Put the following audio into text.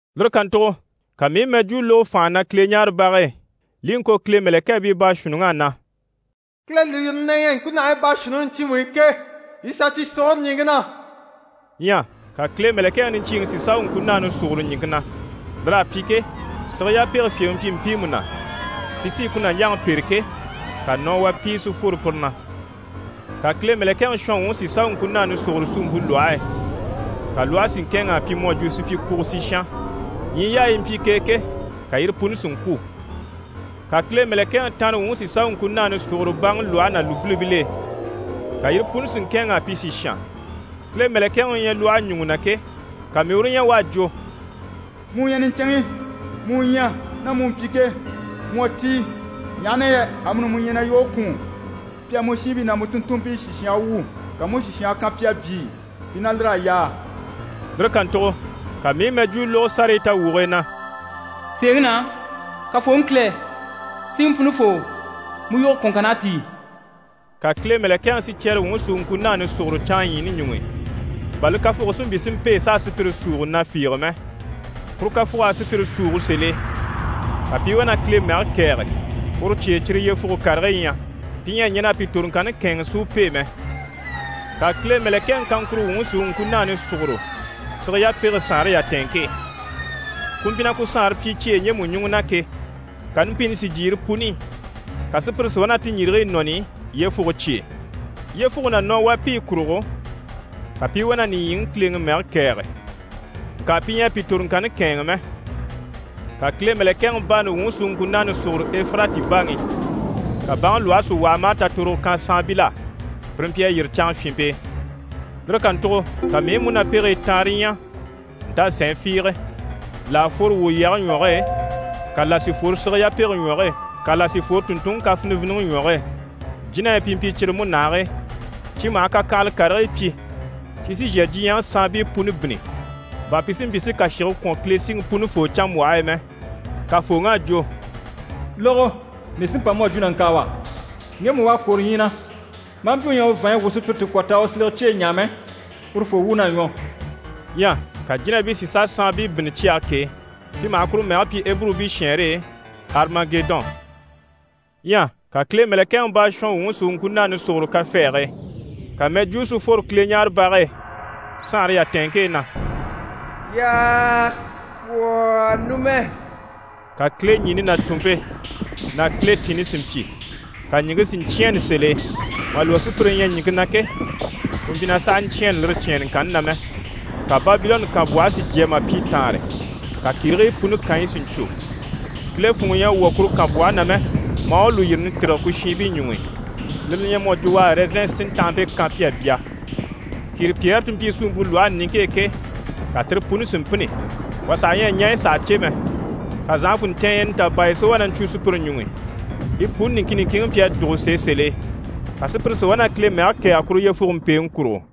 Lire kàntugo ka mii i mɛjwuu lógo fànha na Kileɲaarebage e, li i ŋko Kile mɛ̀lɛkɛɛbii baashuunniŋ'á na: «Kile lùyirini na ɲyɛ ŋkunahigii baashuunniŋi ɲcyiimu i ke, yii sà cyi sùguro ɲìŋke na.» Ɲyɛ ka Kile mɛ̀lɛkɛŋi niɲcyiiŋi si sà u ŋkunaani sùguro ɲìŋke na. Lir'à pyi ke, sige yapege fyèŋi mpyi mpiimu na, pi sí i ku nàɲjaŋi pêre ke, ka nɔwapiye si fworo pire na. Ka Kile mɛ̀lɛkɛŋi shɔnwuŋi si sà u ŋkunaani sùgoro suumpe lwɔhe e, ka lwɔhe si ŋkɛ̂ɛnŋ'a pyi mu à jwo supyikwugo sìshan. Ɲyii yaayi yi mpyi k'e ke, ka yire puni si ŋkwû. Ka Kile mɛ̀lɛkɛŋi tanrewuŋi si sà u ŋkunaani sùgoro baŋi lwɔhe ná lùbilibil'e, ka yire puni si ŋkɛ̂ɛnŋ'a pyi sìshan. Kile mɛ̀lɛkɛŋi u ɲyɛ lwɔhe ɲùŋɔ na ke, ka mii i uru ɲya u à jwo: «Mu u ɲyɛ niɲcɛnŋi, mu u ɲyɛ, ná mu mpyi ke, mu à tíi, ɲaha na yɛ amuni mu ɲyɛ na yoge kwùun. Pi à mu shiinbii ná mu tùnntunmpii sìshange wu, ka mu u sìshange kan pi a byii, pi ná lir'à yaa.» Lire kàntugo ka mii i mɛjwuu lógo sárayi tawwuge e na: «Sèeŋi na, Kafooŋi Kile, Siŋi Punifoo, mu yoge kwɔ̀nŋkann'à tíi.» Ka Kile mɛ̀lɛkɛŋi sicyɛrewuŋi si u ŋkunaani sùgoro canŋaɲyiini ɲuŋ'i, bà li kafuge si mpyi si mpêe s'a sùpyire súuge na fiige mɛ. Kuru kafug'à sùpyire súugo sèl'e. Ka pi i wá na Kile mɛge kɛ̀ɛge, uru cye e cyire yyefuge karigii ɲyɛ. Pi ɲyɛ a ɲɛn'a pi toroŋkanni kɛ̂ɛnŋɛ si u pêe mɛ. Ka Kile mɛ̀lɛkɛŋi kaŋkuro wuŋi si u ŋkunaani sùgoro sige yapege saanre yatɛɛnŋke e. Ku mpyi na ku saanre pyi cyeyi ɲjemu ɲùŋɔ na ke, ka numpini si jyè yire puni i, ka sùpyire si wá na ti ɲjirigii nɔni yyefuge cye e. Yyefuge ná nɔwapiyi kurugo, ka pi i wá na nìɲyiŋi Kileŋi mɛge kɛ̀ɛge, ŋka pi ɲyɛ a pi toroŋkanni kɛ̂ɛnŋɛ mɛ. Ka Kile mɛ̀lɛkɛŋi baani wuŋi si u ŋkunaani sùgoro Efirati baŋi i, ka baŋi lwɔhe si waha maa tatorogo kan saanbil'á, pire mpyi a yîri canŋafyinmpe e. Lire kàntugo ka mii i múnapegii taanre ɲya ntàsɛɛn fiige, là à fworo wwòlyɛge ɲwɔge e, ka là si fworo sige yapege ɲwɔge e, ka là sí fworo tùnntunŋi kafiniviniŋi ɲwɔge e. Jínahii pi mpyi cyire múnahigii, cyi maha kakyanhala karigii pyi. Cyi sí n‑shà diɲyɛŋi saanbii puni bínni, bà pi si mpyi si kàshige kwɔ̀n Kile Siŋi Punifoo canmbwɔhe e mɛ. Kafooŋi à jwo: «Lógo, mii sí n‑pa mu à jwo nàŋkaawa. Ŋgemu u à kwôro ɲyii na, maa mpyi u ɲyɛ a u vàanɲyi wwû sùpyire ti kwɔ̀ t'a u silege cyeyi ɲaa mɛ, urufoo wuun'à ɲwɔ.» Ɲyɛ ka jínabii si sà saanbii bínni cyage k'e, pi maha kuru mɛge pyi Eburubii shɛɛnre e: «Arimagedɔn». Ɲyɛ ka Kile mɛ̀lɛkɛŋi baashɔnwuŋi si u ŋkunaani sùgoro kafɛɛge e. Ka mɛjwuu si fworo Kileɲaarebage e saanre yatɛɛnŋke e na: «Y'à kwɔ̀ numɛ.» Ka kileɲini ná tùnmpe ná kiletinni si mpyi, ka ɲìŋke si ɲcyɛ̂ɛnnɛ sèl'e. Mà lwɔ́ sùpyire ɲyɛ ɲìŋke na ke, ku mpyi na saha ɲcyɛ̂ɛnnɛ lire cyɛ̀ɛnnɛŋkanni na mɛ. Ka Babilɔnni kànbwɔhe si jya mà pyi taanre. Ka kìrigii puni kànyi si ɲcwo. Kile funŋɔ ɲyɛ a wwɔ̀ kuru kànbwɔhe na mɛ, maa u lùyirini tîrige ku shiinbii ɲuŋ'i, lire li ɲyɛ mu à jwo u à ɛrɛzɛn sintanhampe kan pi a bya. Kìripyɛɛre ti mpyi suumpe lwɔhe niŋke e ke, ka tire puni si mpînni, wà saha ɲyɛ a ɲaɲyi saha cè mɛ. Ka zànhafunɲcɛɛnyɛ nitabaaya si wá na ɲcwo sùpyire ɲuŋ'i. Yi puni niŋkin niŋkinŋi mpyi a dùgo sèe sèl'e. Ka sùpyire si wá na Kile mɛge kɛ̀ɛge kuru yyefuge mpèeŋi kurugo.